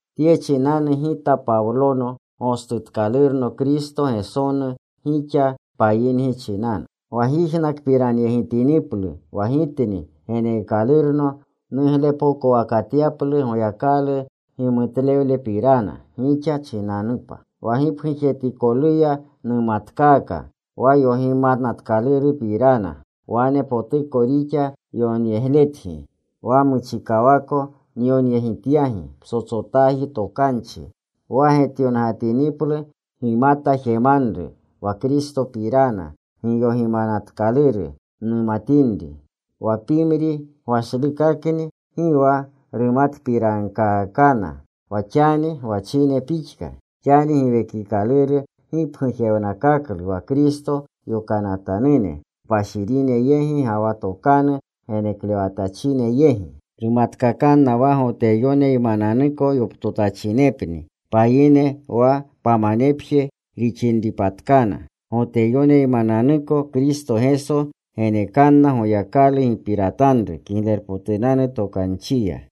Tye chinanu gita Pawlono, gostutkalurno Kristo Gesonu gixa payingi chinanu. Wa gyijnakpiranyegitiniplu wa gitni geneekalurno nuglepokowakatyaplu Goyakalu gimutlewlepirana gixa chinanupa. Wa gipgujetikoluya numatkaaka wa yogimanatkalurupirana. Wane potuko nixa yonyegletgi, wa muchikawako nyonyegityagi ptsotsotaji tokanchi, wa getyongatiniplu gimata jemanru wa Kristopirana giyogimanatkaluru numatinri. Wa pimri gwashlukakni gi wa rumatpirankaakana wa xani gwachine pixka. Xani Giwekikaluru gipgujewnakaklu wa Kristo yokanatanune kpashirine yegi ga wa tokanu geneklewatachine yegi. Rumatkakanna wa Goteyoneymananuko yoptotachinepna payine wa pamanepje rixinripatkana. Goteyoneymananuko Kristo Geso genekanna Goyakalu gipiratanru Kiglerpotunanu Tokanchiya.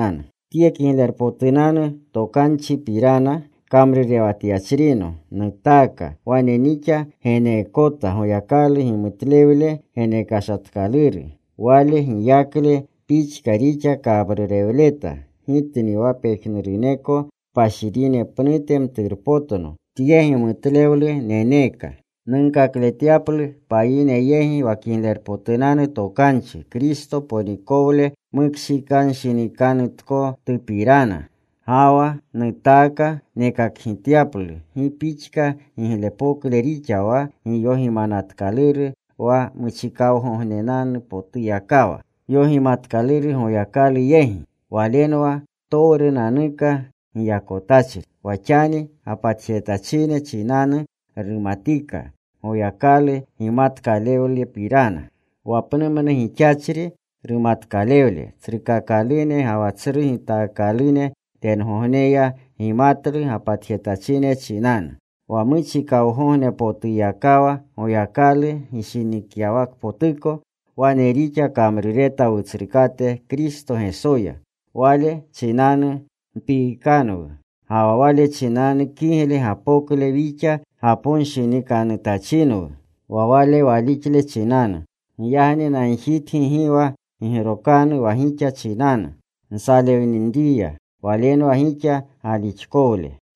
Tye Kiglerpotunanu Tokanchipirana kamrurewatyachrino nutaaka, wane nixa geneekota Goyakalu gimutlewle genekashatkaluru. Wale giyakle pixka rixa kamrurewleta. Gitni wa pejnuruneko kpashirine pnute mturpotno, tye gimutlewlu neneeka nunkakletyaplu payine yegi wa Kiglerpotunanu Tokanchi Kristo ponikolewle mukshikanshinikanutkotupirana. Ga wa nutaaka nekakgityaplu gi pixka giglepokle rixa wa giyogimanatkaluru wa muchikawgognepotuyakawa yogimanatkaluru Goyakalu yegi. Walenwa ptowrunanuka giyakotachri. Wa xani gapatjetachine chinanu rumatika Goyakalu gimatkalewlepirana, wa pnumnu gixachri rumatkalewle. Tsrukakalune ga wa tsru gitaakalune tengogneya gimatlu gapatjetachine chinanu. Wa muchikawgognepotuyakawa Goyakalu gishinikyawakpotuko, wane rixa kamrureta Wutsrukate Kristo Gesoya. Wale chinanu mpiikanwu. Ga wa Wale chinanu kigle gapokle wixa gaponshinikanutachinwu wa Wale walixle chinanu. Giyagni nagjitgi gi wa gigrokanu wa gixa chinanu nsalewninriya. Walenwa gixa galixkolewle.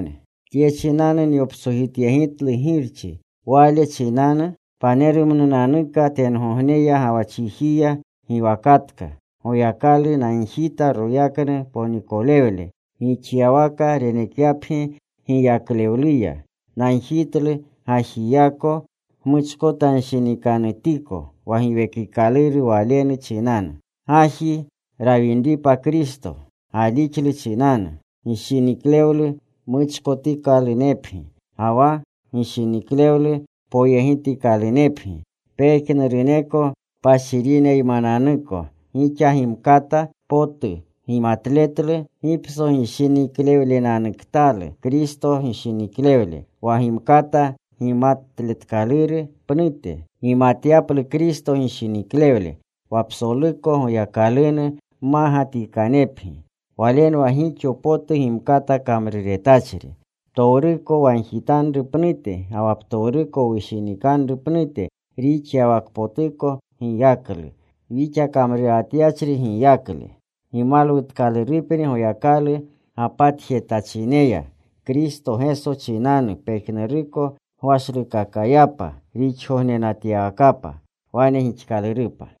Tye chinanu nyoptsojityegitlu Girchi. Wale chinanu panerumnunanuka tengogneya ga wa chijiya giwakatka. Goyakalu nagjita royaknu ponikolewle gixyawaka renekyapgi giyaklewluya. Nagjitlu gajiyako gmuchkotanshinikanutiko wa Giwekikaluru Walenu chinanu, gaji rawinripa Kristo, galixlu chinanu, gishiniklewlu muchkotikalunepgi, ga wa gishiniklewlu poyegitkalunepgi. Pejnuruneko kpashirineymananuko gixa gimkata potu gimatletlu gipsogishiniklewlenanuktalu Kristo gishiniklewle. Wa gimkata gimatletkaluru pnute gimatyaplu Kristo gishiniklewle. Wa psoluko Goyakalunu mmagatikanepgi. Walenwa gixo potu gimkata kamruretachri, ptowruko wagjitanru pnute ga wa ptowruko wushinikanru pnute rixyawakpotuko giyaklu, wixa kamrurewatyachri giyaklu. Gimalwutkalurupni Goyakalu gapatjetachineya Kristo Geso chinanu pejnuruko gwashlukakayapa rixgognenatyawakapa. Wane gixkalurupa.